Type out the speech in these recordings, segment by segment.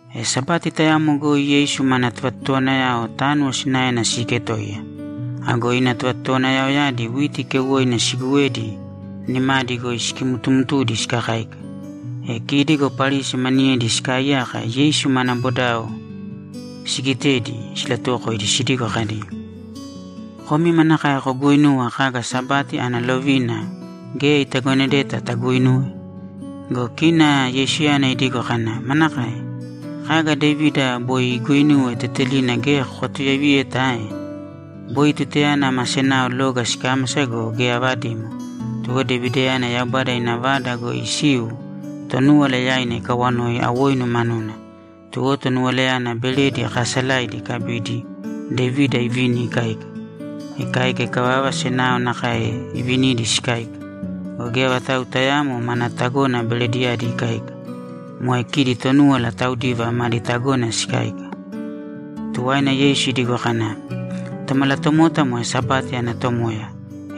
E Sabati tayamo goi Yeisu mana tovatotowanayao tánuwo sinaena siiketoiya. Ago ina tovatotowanayaoyadi witi keuwoina siiguwedi, nimadi goi sikimtumtudi sikakáika. E kidi go Parisi maniyedi sikaaiyaka Yeisu mana bodao sigitedi, silatuwokoidi sidigo kadi, ‘Komi manakae koguuinuwa kaga Sabati ana lovina geya itagonedeta taguinuwe?’ Go kina Yeisuyana idigo kana, ‘Manakae? Kaga Devida boi iguuinuwe tetelina geya kokatuyaiviyeta ae? Boi tutayana ma senao loga sikámasa go, geya avadimo. Tuwo Devidayana Yaubada ina Vada goi isiu, Tonúwala yaina ikawanoi awoinu manuna. Tuwo tonuwalayana beredi kaasalaidi ikabidi, Devida ivini ikáika. Ikáika ikavava, senao nakae ivinidi sikáika. Go geya vatau tayaamo mana tagona berediyadi ikáika. Moe kidi Tonúwala taudiva madi tagona sikáika.’ Tuwaina Yeisu idigo kana, ‘Tomalatomota moe Sabati ana Tomoya,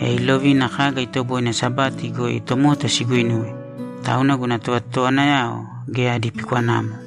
e ilovina kaga itoboine Sabati goi tomota siguinuwe, tauna guna tovatotowanayao geya adi pikwanamo.’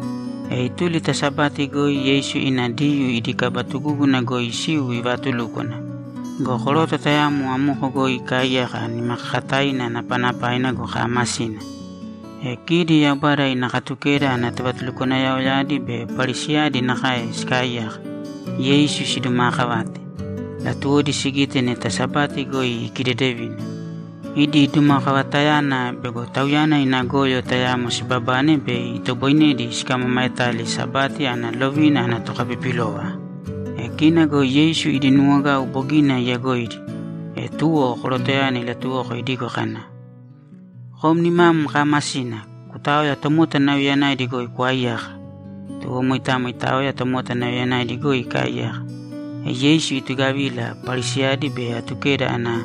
E ituli ta Sabati goi Yeisu ina Diyuu idi kaba tugúguna goi isiu ivaatulúkwana. Go koroto tayamo amoko goi ikaaiyaka nimakakataina napanapaina go, kaamasina. E kidi Yaubada ina Katukeda ana tovatulukwanayaoyadi be Parisiyadi nakae sikaaiyaka, Yeisu sidumaakavate; latuwodi sigite neta Sabati goi ikidedevina. Idi dumakavatayana bego Tauyana ina goyo tayamo sibabane bei itoboinedi sikamamaetali Sabati ana lovina ana tokapipilova. E kina go Yeisu idi nuwogau bogina iyagoidi. E tuwo korotoyana ilatuwoko idigo kana, ‘Kom nimam kaamasina, kutāoya tomota nauyayanaidi goi kwaaiyāka.’ Tuwo moitamo itaoya tomota nauyayanaidi goi ikaaiyaka. E Yeisu itugavila, Parisiyadi be Atukeda ana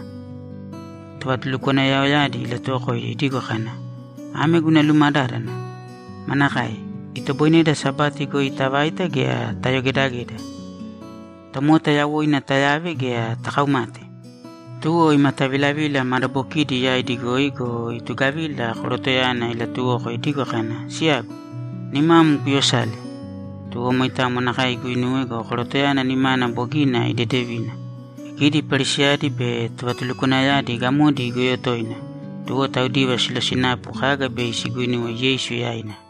tovatulukwanayaoyadi ilatuwokoidi idigo kana, ‘Ame guna lumadádana: Manakae? Itoboineda Sabati goi tavaita gea tayogedageda? Tomota yawoina tayave gea takaumate?’ Tuwo imatavilavila madabokidi yaidi goi go, itugavila korotoyana ilatuwoko idigo kana, ‘Siyagu, nimam kuyosāle.’ Tuwo moitamo nakae iguinuwe go, korotoyana nimana bogina idedevina. E kidi Parisiyadi be tovatulukwanayadi gamodi igoyo toina, tuwo taudiva silosinapu kaga bei siguinuwe Yeisu yaina.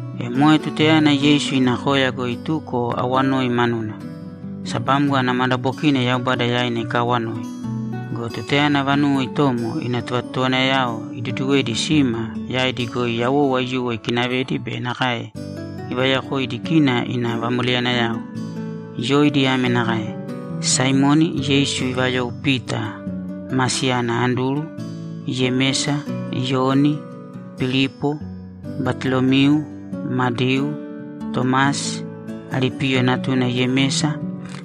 E moe tutayana Yeisu ina koya goi ituko awanoi manuna. Sabamgo ana madabokina Yaubada yaina ikaawanoi. Go tutayana vanuwo itomo, ina tovatotowanayao iduduwedi sima, yaidi goi yawou aiyuwo ikinavedi be nakae ivayokoidi kidi ina vamoleyanayao. Yoidi ame nakae: Saimoni (Yeisu ivayou Pita) ma siyana Anduru, Yemesa, Iyoni, Pilipo, Batolomiu, Madiu, Tomasi, Alipiyo natuna Yemesa,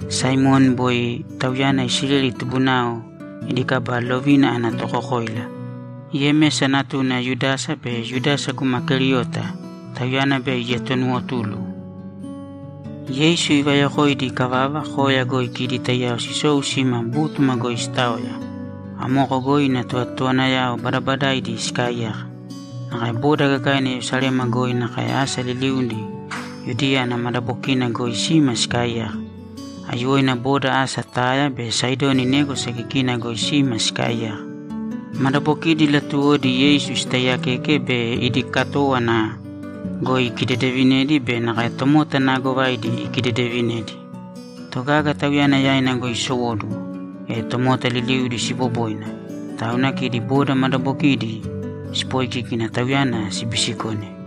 Saimoni (boi tauyana Isileli tubunao idi kaba lovina ana tokokoila), Yemesa natuna Yudasa be Yudasa guma Keriota, tauyana bei ietonuwotulu. Yeisu ivayokoidi ikavava, koya goi kidi taiyao sisou sima bútuma goi sitaoya. Amoko goi ina tovatotowanayao badabadaidi sikaaiyaka. Nakae boda gagaina Yerusalema goi nakae asa liliudi Yudiya ana madabokina goi sima sikaaiyaka. Aiyuwoina boda asa Taya be Saidoni négwasa kikina goi sima sikaaiyaka. Madabokidi latuwodi Yeisu sitaiyakeke be idi katówana goi ikidedevinedi be nakae tomota naagovaidi ikidedevinedi. Togaga Tauyana yaina goi isowóduwo, e tomota liliudi siboboina, tauna kidi boda madabokidi sipoikíkina Tauyana sibisikone.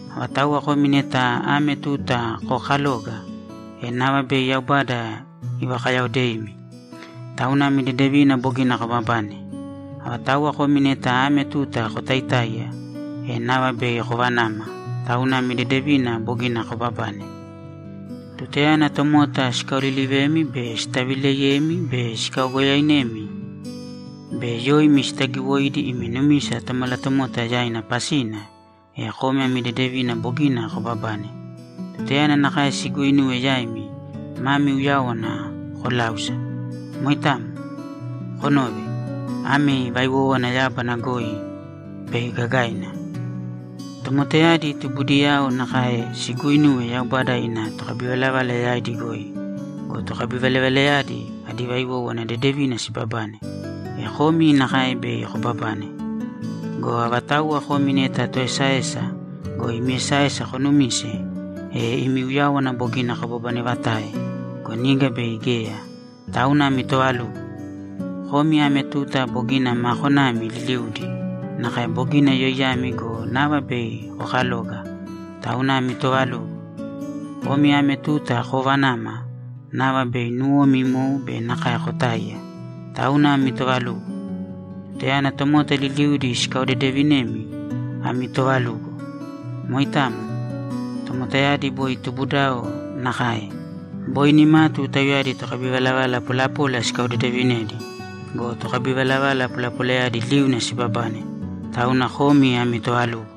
Avatauwa komi neta ame tuta kookaloga, e nava bei Yaubada ivakayaodeimi, tauna ami dedevina bogina koobabane. Avatauwa komi neta ame tuta kotaitáiya, e nava bei kovanama, tauna ami dedevina bogina koobabane. Tutayana tomota sikaolilivemi be sitavileiyemi be sikaogoyoemi be yoimi sitagiwoidi imi numisa Tomalatomota yaina pasina, e komi ami dedevina bogina koobabane. Tutayana nakae siguuinuwe yaimi, mami uyáwana kolāusa. Moitamo. Konōve. Ami vaiwówana yábana goi bei gagaina. Tomotayadi tubudiyao nakae siguuinuwe Yaubada ina tokabivalavala yaidi goi go, tokabivalavalayadi adi vaiwówana dedevina sibabane. E komi nakae bei koobabane. Go avatauwa komi neta toesaesa go, imi esaesa konumise, e imi uyáwana bogina kobabanevatae go, niga bei geya. Tauna ami toovalugo! Komi ame tuta bogina maa konami liliudi, nakae bogina yoiyami go, nava bei kokaloga. Tauna ami toovalugo! Komi ame tuta koovanama, nava bei nuwomi imou be nakae kotáiya. Tauna ami toovalugo. Tutayana tomota liliudi sikaodedevinemi, ami toovalugo. Moitamo. Tomotayadi boi tubudiyao nakae. Boi nimatu tauyadi tokabivalavala polapola sikaodedevinedi go, tokabivalavala polapolayadi liuna sibabane. Tauna komi ami toovalugo.’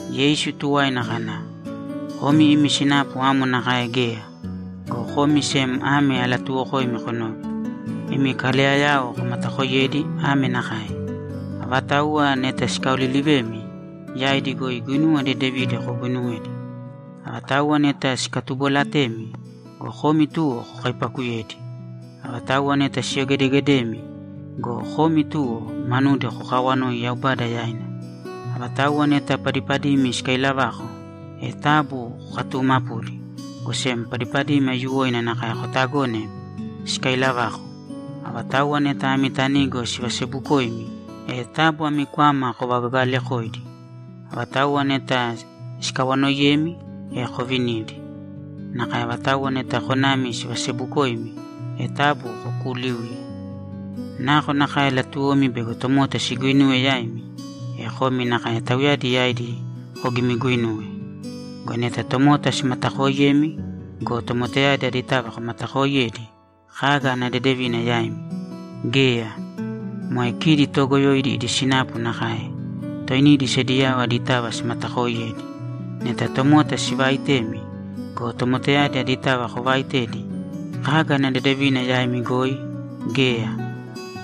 Yeisu tuwaina kana, ‘Komi imi sinapu amo nakae geya, go komi sem ame alatuuwokoimi konōve: Imi kaleyayao komatakoiyēdi ame nakae: Avatauwa neta sikaolilivemi, yaidi goi guinuwa dedevidi koguuinuwēdi. Avatauwa neta sikatubolatemi go, komi tuwo kokaipaakuyēdi. Avatauwa neta siyogedegedemi go, komi tuwo, manudi kokaawanōi Yaubada yaina. Avatauwa neta padipadimi sikailavako, e taabu kokatuumapūdi, go sem padipadimi aiyuwoina nakae kotagōne sikailavako. Avatauwa neta ami tanigo sivasebukoimi, e taabu ami kwama kovakagagalekōidi. Avatauwa neta sikawanoiyemi, e kovinīdi. Nakae avatauwa neta konami sivasebukoimi, e taabu kokuuliūye. Nakonakae latuwomi bego tomota siguinuwe yaimi, e komi nakae tauyadi yaidi kogimiguinūwe. Go neta tomota simatakooiyemi go, tomotayadi aditava komatakooiyedi, kaga ana dedevina yaimi? Geya. Moe kidi toogoyoidi idi sinapu nakae. Toinidi sediyao aditava simatakooiyedi. Neta tomota sivaaitemi go, tomotayadi aditava kovaaitedi, kaga ana dedevina yaimi goi? Geya.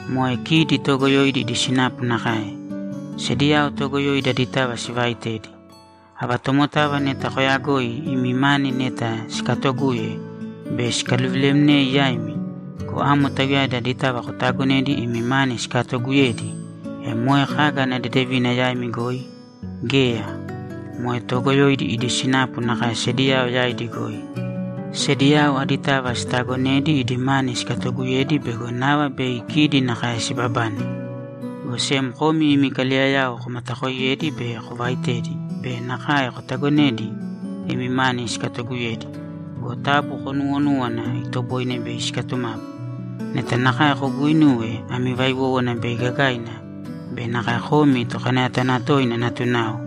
Moe kidi toogoyoidi idi sinapu nakae. Sediyao toogoyoidi aditava sivaaitedi. Ava tomotava neta koyagoi imi mani neta sikatoguye bei sikaluvilemnei yaimi go, amo tauyadi aditava kotaagonedi imi mani sikatooguyedi, e moe kaga ana dedevina yaimi goi? Geya. Moe toogoyoidi idi sinapu nakae sediyao yaidi goi. Sediyao aditava sitaagonedi idi mani sikatooguyedi bego nava bei kidi nakae sibabane. Go sem komi imi kaleyayao komatakoiyēdi be kovaitēdi be nakae kotagonēdi imi mani sikatoguyedi go, taabu konuuwonūwana itoboine bei sikatumapu. Neta nakae koguuinuwe, ami vaiwówana bei gagaina be nakae komi Tokanayatanatoina natunao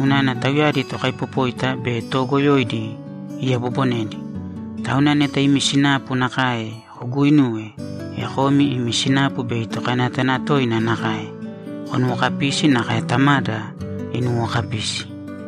unana tauyadi tokaipopóita be toogoyoidi iyabobonedi. Tauna neta imi sinapu nakae koguuinuwe, e komi imi sinapu bei Tokanayatanatoina nakae. Konuwokapīsi, nakae Tamada inuwokapisi.’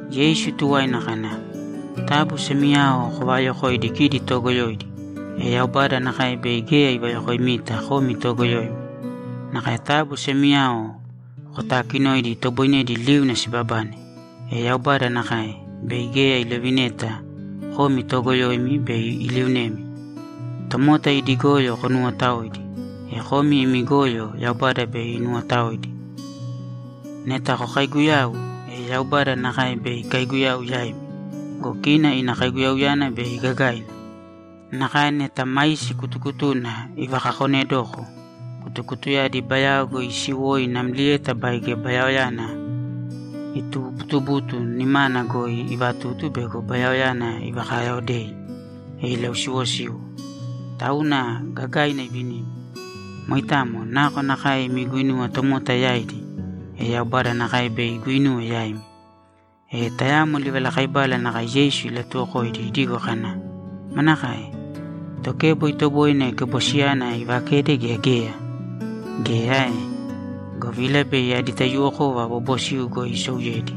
Yeisu tuwaina kana, ‘Taabu semiyao kovaayokōidi kidi toogoyoidi, e Yaubada nakae bei geya ivayokoimita komi toogoyoimi. Nakae taabu semiyao kotaakinōidi itoboinedi liuna sibabane, e Yaubada nakae, bei geya ilovineta komi toogoyoimi bei iliunemi. Tomota idi goyo konuwotaōidi, e komi imi goyo Yaubada bei inuwotaoidi. Neta kokaiguyau, e Yaubada nakae bei ikaiguyau yaimi go, kina ina kaiguyauyana bei gagaina. Nakae neta maisi kutukutuna ivakakonedoko. Kutukutuyadi bayao goi isiwoi namlieta baige bayaoyana itubuutubutu, nimana goi ivatutu bego bayaoyana ivakayaodei, e ilausiwosiwo. Tauna gagaina ivinimi. Moitamo. Nakonakae imi guinuwa tomota yaidi, e Yaubada nakae bei iguinuwe yaimi.’ E tayamo livalakaibala nakae Yeisu ilatuwokoidi idigo kana, ‘Manakae? Tokebo itoboine kebosiyana ivakede, gea geya? Geya ae? Govila bei adi taiyuwokova bobosiu goi isouyedi.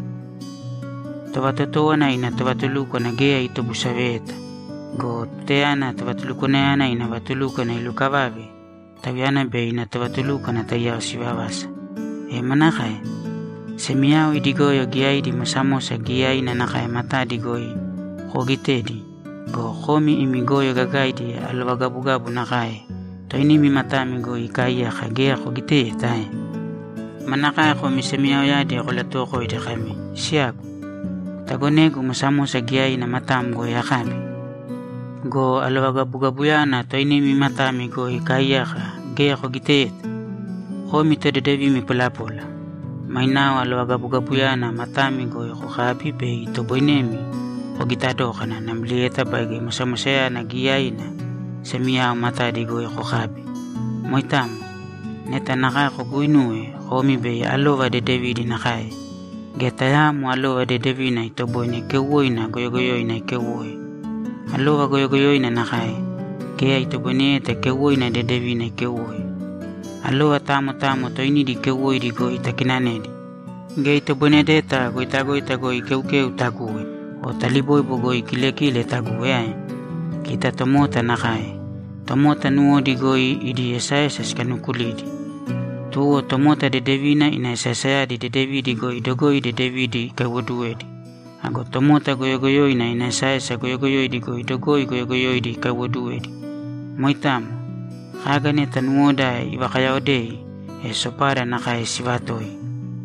Tovatotówana ina tovatulúkwana geya itobusaveyeta. Go tutayana tovatulukwanayana ina vatulúkwana ilukavave, tauyana be ina tovatulúkwana taiyao sivavasa. E manakae? Semiyao idi goyo giyaidi mosamosa giyaina nakae matadi goi koogitedi go, komi imi goyo gagaidi alovagabugabu nakae toinimi matami goi ikaaiyaka geya kogiteyeta ae? Manakae komi semiyaoyadi kolatuwokoidi kami, “Siyagu, kutagonēgu mosamosa giyaina matam goi akabi”? Go alovagabugabuyana toinimi matami goi ikaaiyaka geya kogiteyeta! Komi todedevimi polapola! Mainao alovagabugabuyana matami goi kokābi bei itoboinemi kogita dókana namlieta baige mosamosayana giyaina semiyao matadi goi kokabi. Moitamo. Neta nakae koguuinuwe, komi bei alova dedevidi nakae. Geya tayaamo alova dedevina itoboine keuwoina goyogoyoina ikeuwoe. Alova goyogoyoina nakae; geya itoboineyeta keuwoina dedevina ikeuwoe. Alova tamo tamo toinidi keuwoidi goi takinanedi. Geya itoboinedeta goitagoita goi keukeu taguwe o taliboibo goi kilekile taguwe ae? Kita tomota nakae. Tomota nuwodi goi idi esaesa sikanukulidi. Tuwo tomota dedevina ina esaesayadi dedevidi goi dogoi dedevidi ikaiwoduwedi. Ago tomota goyogoyoina ina esaesa goyogoyoidi goi dogoi goyogoyoidi ikaiwoduwedi. Moitamo. Kaga neta nuwoda ivakayaodei, e sopada nakae sivatoi.’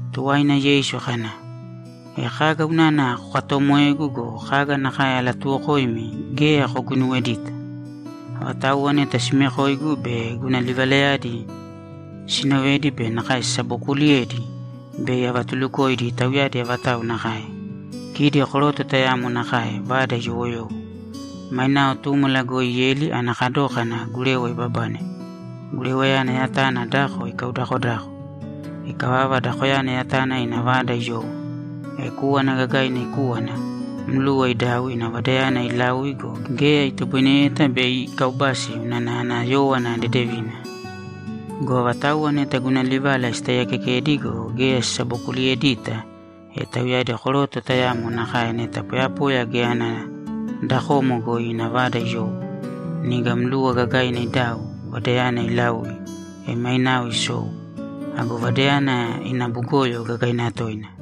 Tuwaina Yeisu kana, ‘E kaga unana kokatomoegu go, kaga nakae alatuuwokoimi geya koguinuwedita? Avatauwa neta simekoigu be guna livalayadi sinovedi be nakae sisabokuliyedi, bei avatulukoimi tauyadi avatau nakae. Kidi koroto tayamo nakae vada iyowoyowo. Mainao túmala goi ieli ana kadókana gurewa ibabane. Gurewayana yatana dako ikaudakodako. Ikavava, dakoyana yatana ina vada iyowo. E kúwana gagaina ikúwana, mluwa idau ina vadayana ilaui go, geya itoboineyeta bei ikaubasi unana ana yówana dedevina. Go avatauwa neta guna livala sitaiyakekedi go, geya sisabokuliyedita, e tauyadi koroto tayamo nakae neta poyapoya geya ana dakomo goi ina vada iyowo. Niga mluwa gagaina idau, vadayana ilaui, e mainao isou. Ago vadayana ina bugoyo gagaina toina.’